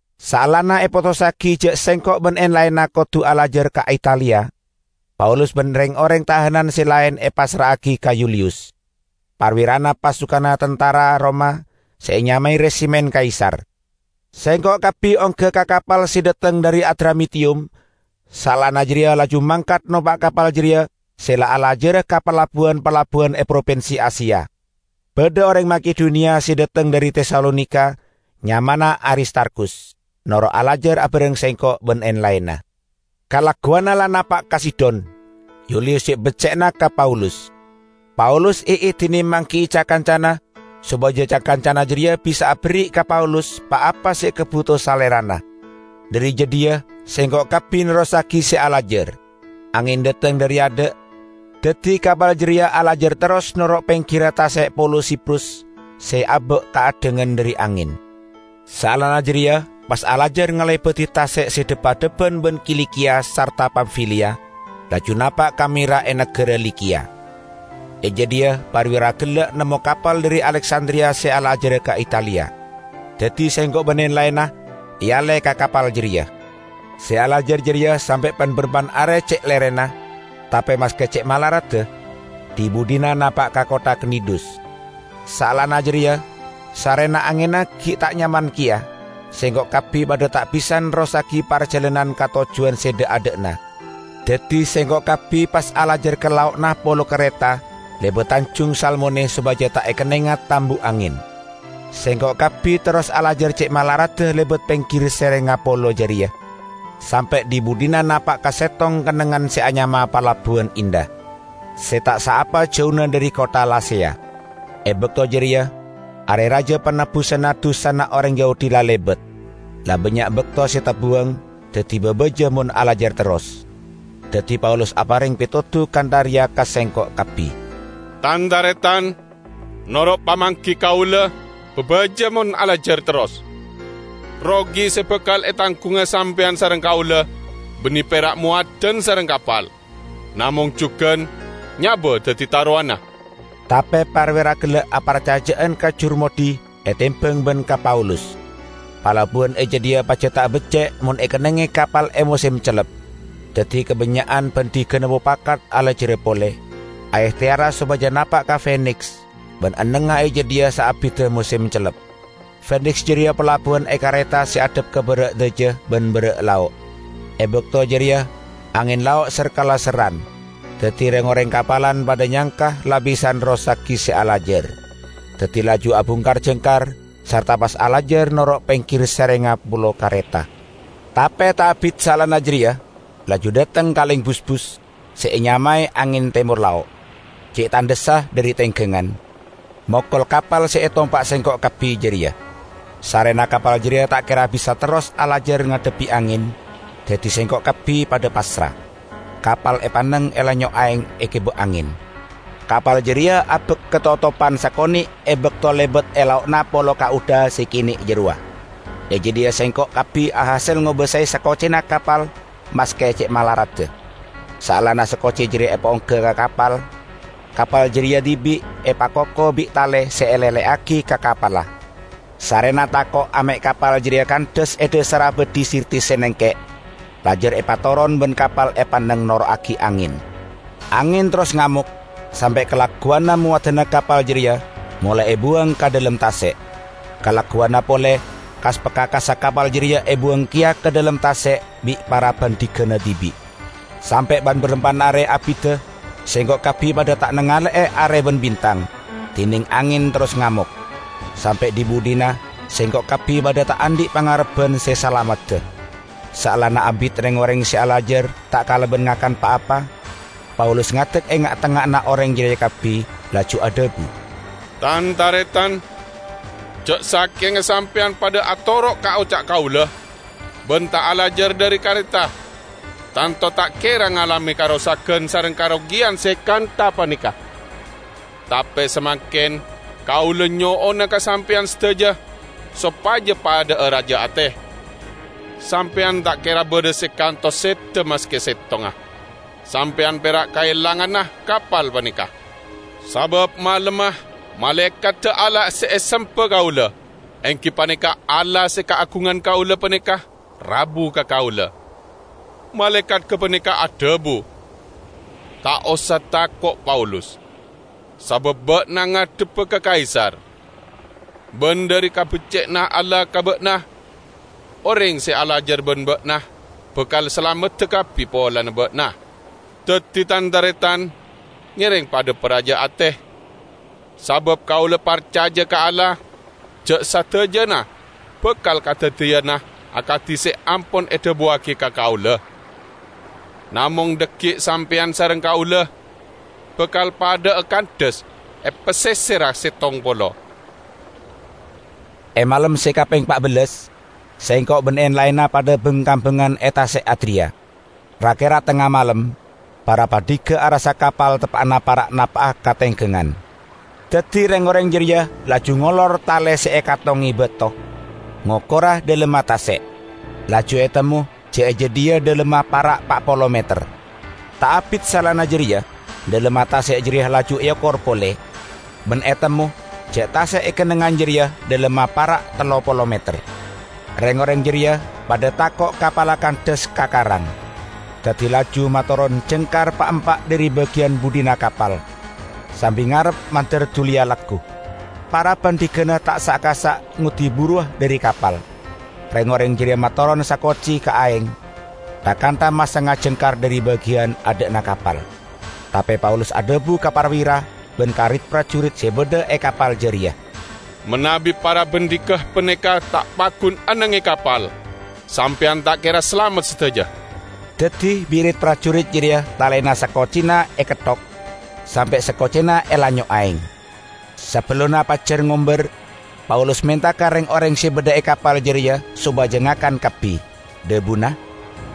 Saellana epotossagi ja' sengko' ban en-laenna kodu alajar ka Italia, Paulus ban reng-oreng tahanan se laen epassra'agi ka Yuliyus, parwirana pasukanna tantara Roma se enyamae "Resimen Kaisar". Sengko' kabbi ongga ka kapal se dhateng dhari Adramitiyum, saellana jareya laju mangkat nompa' kapal jareya se la alajara ka palabbuwan-palabbuwan e propinsi Asia. Badha oreng Makedoniya se dateng dhari Tesalonika, nyamana Aristarkhus, noro' alajar bareng sengko' ban en-laenna. Kalagguwanna la napa' ka Sidon. Yuliyus ce' becce'na ka Paulus. Paulus eedine manggi'i ca-kancana sopaja ca-kancana jareya bisa aberri' ka Paulus pa-apa se ekabuto salerana. Dhari jadhiya sengko' kabbi nerrossagi se alajar. Angen dhateng dhari adha', daddi kapal jareya alajar terros noro' penggirra tase' polo Siprus se abak kaaddhangan dhari angen. Saellana jareya pas alajar ngalebadi tase' se dhep-adhebban ban Kilikiya sarta Pamfiliya, laju napa' ka Mira e nagara Likiya. E jadhiya parwira gella' nemmo kapal dhari Aleksandriya se alajara ka Italia. Daddi sengko' ban en-laenna ealle ka kapal jareya. Se alajar jareya sampe' pan-barampan are ce' lerena, tape maske ce' malaradda, dhi-budhina napa' ka kottha Knidus. Saellana jareya, sarrena angenna gi' ta' nyaman keya, sengko' kabbi padha ta' bisa nerrossagi parjalanan ka tojjuwan se dha'-adha'na. Daddi sengko' kabbi pas alajar ka lao'na polo Kareta lebat Tanjung Salmone sopaja ta' ekennenga tambu angen. Sengko' kabbi terros alajar ce' malaradda lebat penggir serengnga polo jareya sampe' dhi-budhina napa' ka settong kennengngan se anyama Palabbuwan Indah, se ta' saapa jauna dhari kottha Laseya. E bakto jareya Are Raja Panebbusanna Dusana oreng Yahudi la lebat. La bannya' bakto se tabuwang, daddi babaja mon alajar terros. Daddi Paulus apareng petodu kantha reya ka sengko' kabbi, "Tan-taretan, noro' pamanggi kaula babaja mon alajar terros. Rogi se bakal etanggunga sampeyan sareng kaula banne pera' mowadan sareng kapal, namong jugan nyaba daddi tarowanna." Tape parwira gella' aparcaja'an ka jurmoddhi etembang ban ka Paulus. Palabbuwan e jadhiya pajat ta' becce' mon ekennengnge kapal e mosem cellep. Daddi kabannya'an bandhigana mopakat alajara pole, aehteyara sopaja napa' ka Feniks ban ennengnga e jadhiya saabidda mosem cellep. Feniks jareya palabbuwan e Kareta se addhep ka bara' dhaja ban bara' lao'. E bakto jareya angen lao' ser-kalesserran. Daddi reng-oreng kapalan padha nyangka la bisa nerrossagi se alajar. Daddi laju abungkar jangkar sarta pas alajar noro' penggir serengnga polo Kareta. Tape ta' abit saellana jareya laju dhateng kaleng busbus se enyamae angen Temor Lao' - ce' tandhessa dhari tenggangan, mokol kapal se etompa' sengko' kabbi jareya. Sarrena kapal jareya ta' kera bisa terros alajar ngadhebbi angen, daddi sengko' kabbi padha passra, kapal epanneng elanyo' aeng egiba angen. Kapal jareya abak katotoban sakone' e bakto lebat e lao'na polo Kauda se kene' jarowa. E jadhiya sengko' kabbi ahasel ngobasae sakocina kapal maske ce' malaradda. Saellana sakoci jareya epaongga ka kapal, kapal jareya dibi' epakoko bi' tale se ele'le'agi ka kapalla. Sarrena tako' ame' kapal jareya kandhas e dhasarra beddhi Sirtis se nengke', lajar epatoron, ban kapal epanneng noro'agi angen. Angen terros ngamok, sampe' kalagguwanna mowadanna kapal jareya molae ebuwang ka dhalem tase'. Kalagguwanna pole kas-pakakassa kapal jareya ebuwang keya ka dhalem tase' bi' para bandhigana dibi'. Sampe' ban-barampan are abidda sengko' kabbi padha ta' nangale'e are ban bintang, dineng angen terros ngamok. Sampe' dhi-budhina sengko' kabbi padha ta' andhi' pangarebban se salamedda. Saellana abit reng-oreng se alajar ta' kalaban ngakan pa- apa, Paulus ngadek e nga'-tengnga'anna oreng jareya kabbi, laju adhabu, "Tan-taretan¡ Ja' sakenga sampeyan padha atoro' ka oca' kaula ban ta' alajar dhari Kareta, tanto ta' kera ngalame karosagan sareng karogiyan se kantha paneka. Tape samangken kaula nyo'ona ka sampeyan sadaja sopaja padha'a raja ate. Sampeyan ta' kera badha se kantos seda maske settonga» sampeyan pera' kaelangana kapal paneka. Sabaâ malemma malaekadda Allah se esemba kaula, enggi paneka Allah se kaagungan kaula paneka, rabu ka kaula. Malaekat gapaneka adhabu, 'Ta' osa tako', Paulus¡ Sabaâ ba'na ngadhebba ka Kaisar. Ban dhari kabecce'anna Allah ka ba'na, oreng se alajar ban ba'na bakal salamedda kabbi polana ba'na.' Daddi, tan-taretan, ngereng padha paraja ate¡ Sabaâ kaula parcaja ka Allah ja' sadajana bakal kadaddiyana akadi se ampon edhabuwagi ka kaula. Namong dhaggi' sampeyan sareng kaula bakal padha'a kandhas e paseserra settong polo." E malem se kapeng pa' bellas sengko' ban en-laenna padha bang-kambangan e Tase' Adriya. Ra-kera tengnga malem para bandhiga arassa kapal teppa'na para' napa'a ka tenggangan. Daddi reng-oreng jareya laju ngolor tale se ekattonge bato, ngokora dhalemma tase'. Laju etemmo ja' e jadhiya dhalemma para' pa' polo meter. Ta' abit saellana jareya dhalemma tase' jareya laju eokor pole, ban etemmo ja' tase' e kennengngan jareya dhalemma para' tello polo meter. Reng-oreng jareya padha tako' kapalla kandhas ka karang, daddi laju matoron jangkar pa'-empa' dhari bagiyan budhina kapal, sambi ngarep mandar duliya laggu. Para bandhigana ta' asa'-kasa' ngoddi buruwa dhari kapal» reng-oreng jareya matoron sakoci ka aeng, tha-kantha masanga jangkar dhari bagiyan adha'na kapal. Tape Paulus adhabu ka parwira ban ka rit-parjurit se badha e kapal jareya, "Manabi para bandhiga paneka ta' paggun enneng e kapal, sampeyan ta' kera salamet sadaja." Daddi bi' rit-parjurit jareya talena sakocina eketthok, sampe' sakocina elanyo' aeng. Sabellunna pajjar ngombar, Paulus menta ka reng-oreng se badha e kapal jareya sopaja ngakan kabbi. Dhabuna,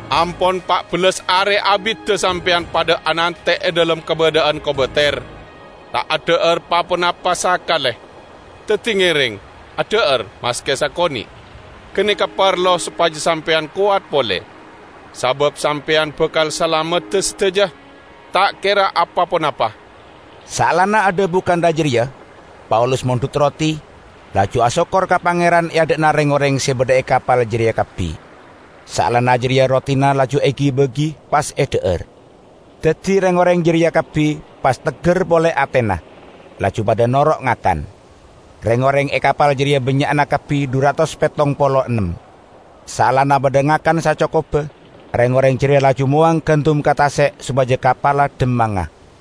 "Ampon pa' bellas are abidda sampeyan padha anante' e dhalem kabadha'an kobater, ta' adha'ar pa-ponapa sakale. Daddi ngereng, adha'ar maske sakone'» ganeka parlo sopaja sampeyan kowat pole. Sabaâ sampeyan bakal salamedda sadaja, ta' kera apa-ponapa." Saellana adhabu kantha jareya Paulus mondhut roti, laju asokkor ka Pangeran e adha'na reng-oreng se badha e kapal jareya kabbi. Saellana jareya rotina laju egi-bagi, pas edha'ar. Daddi reng-oreng jareya kabbi pas tegger pole atena, laju padha noro' ngakan. Reng-oreng e kapal jareya bannya'na kabbi dhu ratos pettong polo ennem. Saellana padha ngakan sacokobba reng-oreng jareya laju mowang gandum ka tase' sopaja kapalla dhammanga.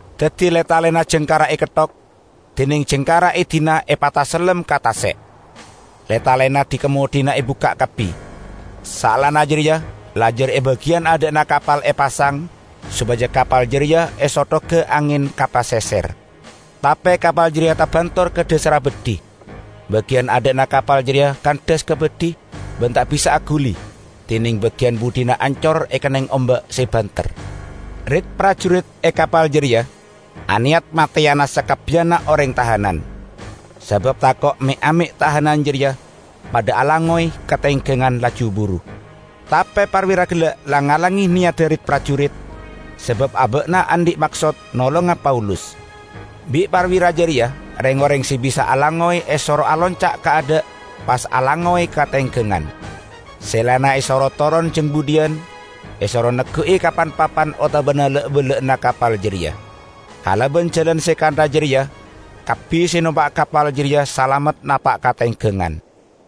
Daddi le-talena jangkarra eketthok, dineng jangkarra edina epatasellem ka tase'. Le-talena dhi-kamoddhi ebukka' kabbi. Saellana jareya lajar e bagiyan adha'na kapal epasang, sopaja kapal jareya esothoga angen ka paseser. Tape kapal jareya tabentor ka dhasarra beddhi. Bagiyan adha'na kapal jareya kandhas ka beddhi ban ta' bisa aguli, dineng bagiyan budhina ancor ekenneng omba' se banter. Rit-parjurit e kapal jareya aneyat mateyana sakabbiyanna oreng tahanan, sabaâ tako' me'-ame' tahanan jareya padha alangngoy ka tenggangan laju buru. Tape parwira gella' lang-ngalange neyadda rit-parjurit, sabaâ aba'na andhi' maksoä nolonga Paulus. Bi' parwira jareya reng-oreng se bisa alangngoy esoro alonca' kaadha' pas alangngoy ka tenggangan; Se laenna esoro toron jang budhiyan, esoro neggu'i ka pan- papan otabana la'-bella'anna kapal jareya. Kalaban jalan se kantha jareya kabbi se nompa' kapal jareya salamet napa' ka tenggangan.